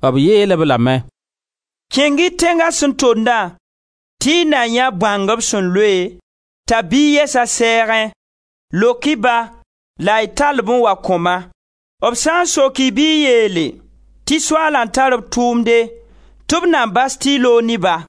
B yeel-b lame: «Kẽng-y tẽnga sẽn tondã, tɩ y na yãe bõang b sẽn loe t'a biig yɛs a sɛɛgẽ; lok-y ba la y tall-b n wa kõ-ma. B sã n sok-y bɩ y yeele tɩ yaa Soaala n tar b tʋʋmde, tɩ b na bas tɩ y loog ne-ba.»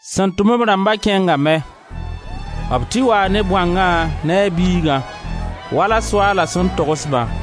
Sẽn tʋm b rãmba kẽngame. B tɩ waa ne bõangã ne a biigã, wala Soaala sẽn togs-bã.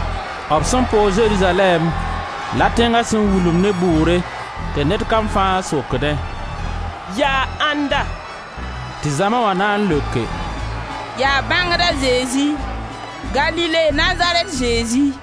B sẽn poog Zerizalɛɛm la tẽnga sẽn wulumd ne bʋʋre tɩ ned kam fãa sokdẽ: «Yaa ãnda?» Tɩ zãma wã na n leoke: «Yaa bãngd a Zezi, Galile Nazarɛt Zezi.»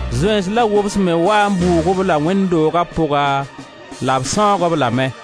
Zoeens la wobs me waa n bʋʋg-b la wẽnd dooga pʋga la b sãoog-b lame.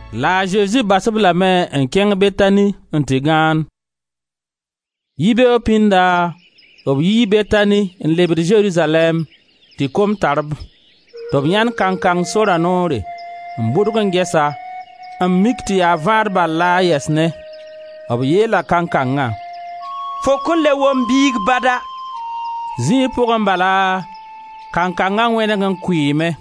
La a Zezi bas-b lame n kẽng Betani n tɩ gãand. Yibeoog pĩnda b yii Betani n lebd Zerizalɛɛm, tɩ kom tar-b. Tɩ b yãend kankang sora noore n bʋdg n ges-a, n mik tɩ yaa vãad bal la a yɛs ne. B yeela kankangã: «Fo kõn le wom biig bada.» Zĩig pʋgẽ bala, kankanga wẽneg n kʋɩɩme.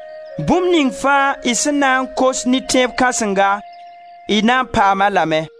Bũmb ning fãa y sẽn na n kos ne tẽeb kãsenga, y na n paam-a lame.»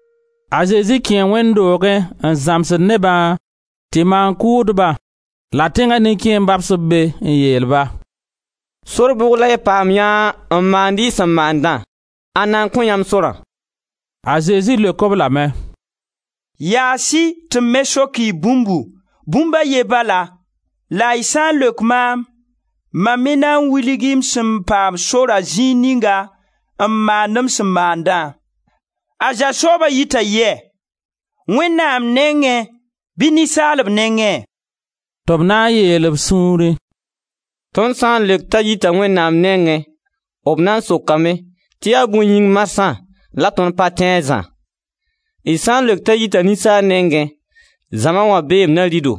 A Zezi kẽe Wẽnd doogẽ n zãmsd nebã tɩ maan-kʋʋdba la tẽnga nin-kẽemb babs-b be n yeel-ba: «Sor bʋg la y paamyã n maand y sẽn maandã? Ãnda n kõ yãmb sorã?» A Zezi leok-b lame: «Yaas-y tɩ m me sok-y bũmbu, bũmb a ye bala, la y sã n leok maam, mam me na wilg-y m sẽn paam sorã zĩig ninga n maand m sẽn maandã: A Zã sooba yita yɛ? Wẽnnaam nengẽ bɩ ninsaalb nengẽ? Tɩ b na n yeel b sũurẽ: ‹Tõnd sã n leok t'a yita Wẽnnaam nengẽ, b na n sokame tɩ yaa bõe yĩng marsã la tõnd pa tẽ a Zã. D sã n leok t'a yita ninsaal nengẽ, zãma wã beem na rɩ-do,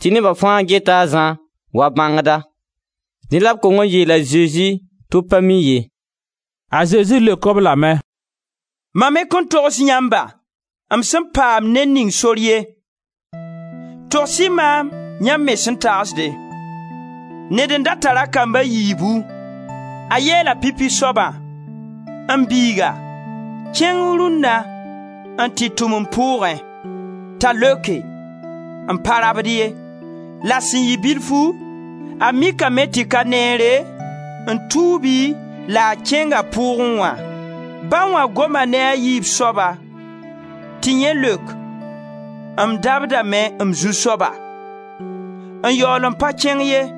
tɩ neba fãa geta a Zã wa bãngda.› Dẽ la b kong n yeel a Zezi tɩ b pa mi ye.» A Zezi leok-b lame: «Mam me kõn togs yãmba m sẽn paam ned ning sor ye.» «Togs-y maam yãmb me sẽn tagsde: ned n da tar a kamb a yiibu. A yeela pipi soaba: ‹M biiga, kẽng rũnna n tɩ tʋm m pʋʋgẽ.› T'a leoke: ‹M pa rabd ye.› La sẽn yɩ bilfu, a mikame tɩ ka neere, n tuubi, la a kẽnga pʋʋgẽ wã. Ba wã goma ne a yiib soaba, tɩ yẽ leok: ‹M dabdame, m zu-soaba› n yaool n pa kẽng ye.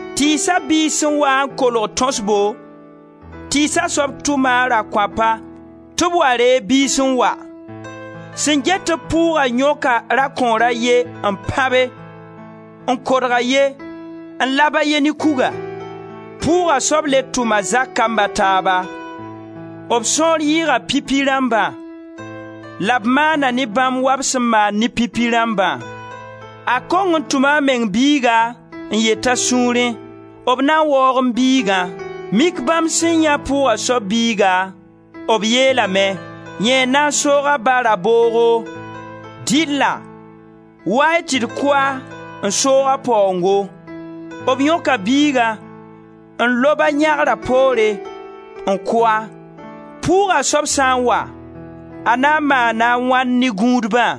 Tɩɩsa biis sẽn waa n kolg tõsbo, tɩɩsa soab tʋma a rakõapa tɩ b wa reeg biis n wa. Sẽn get-b pʋʋga yõka rakõor a ye n pãbe, n kodg a ye, n lab a ye ne kuga. Pʋʋga soab le tʋm a zak kamb a taaba; b sõor yɩɩga pipi rãmbã, la b maana ne bãmb wa b sẽn maan ne pipi rãmbã. A kong n tʋma a meng biiga n yet a sũurẽ: ‹B na waoog m bigã.› Mik bãmb sẽn yãe pʋʋga soab biiga, b yeelame: ‹Yẽ n na n soog a ba raboogo, dɩlla wa-y tɩ d kʋ-a n soog a paoongo.› B yõka biigã n lob-a yãgra poore n kʋ-a. Pʋʋga soab sã n wa, a na n maana a wãn ne gũudbã?»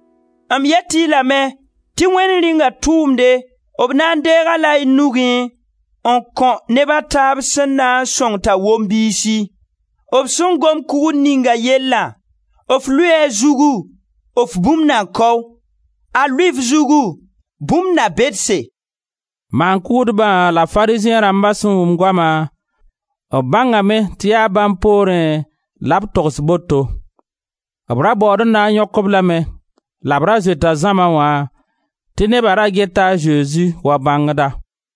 M yet-y lame tɩ Wẽnd Rĩunga tʋʋmde, b na n deeg-a-la y nugẽ n kõ neb a taaba sẽn na n sõng t'a wom biisi. [ B sẽn gom kugr ninga yellã, f lʋɩɩ a zugu, f bũmb na kao, a lʋɩɩ f zugu bũmb na bedse.]» Maan-kʋʋdba la Farizẽ rãmba sẽn wʋm goama, b bãngame tɩ yaa bãmb poorẽ la b togs boto. B ra baood n na n yõk-b lame la b ra zoeta zãma wã, tɩ neba ra geta a Zezi wa bãngda.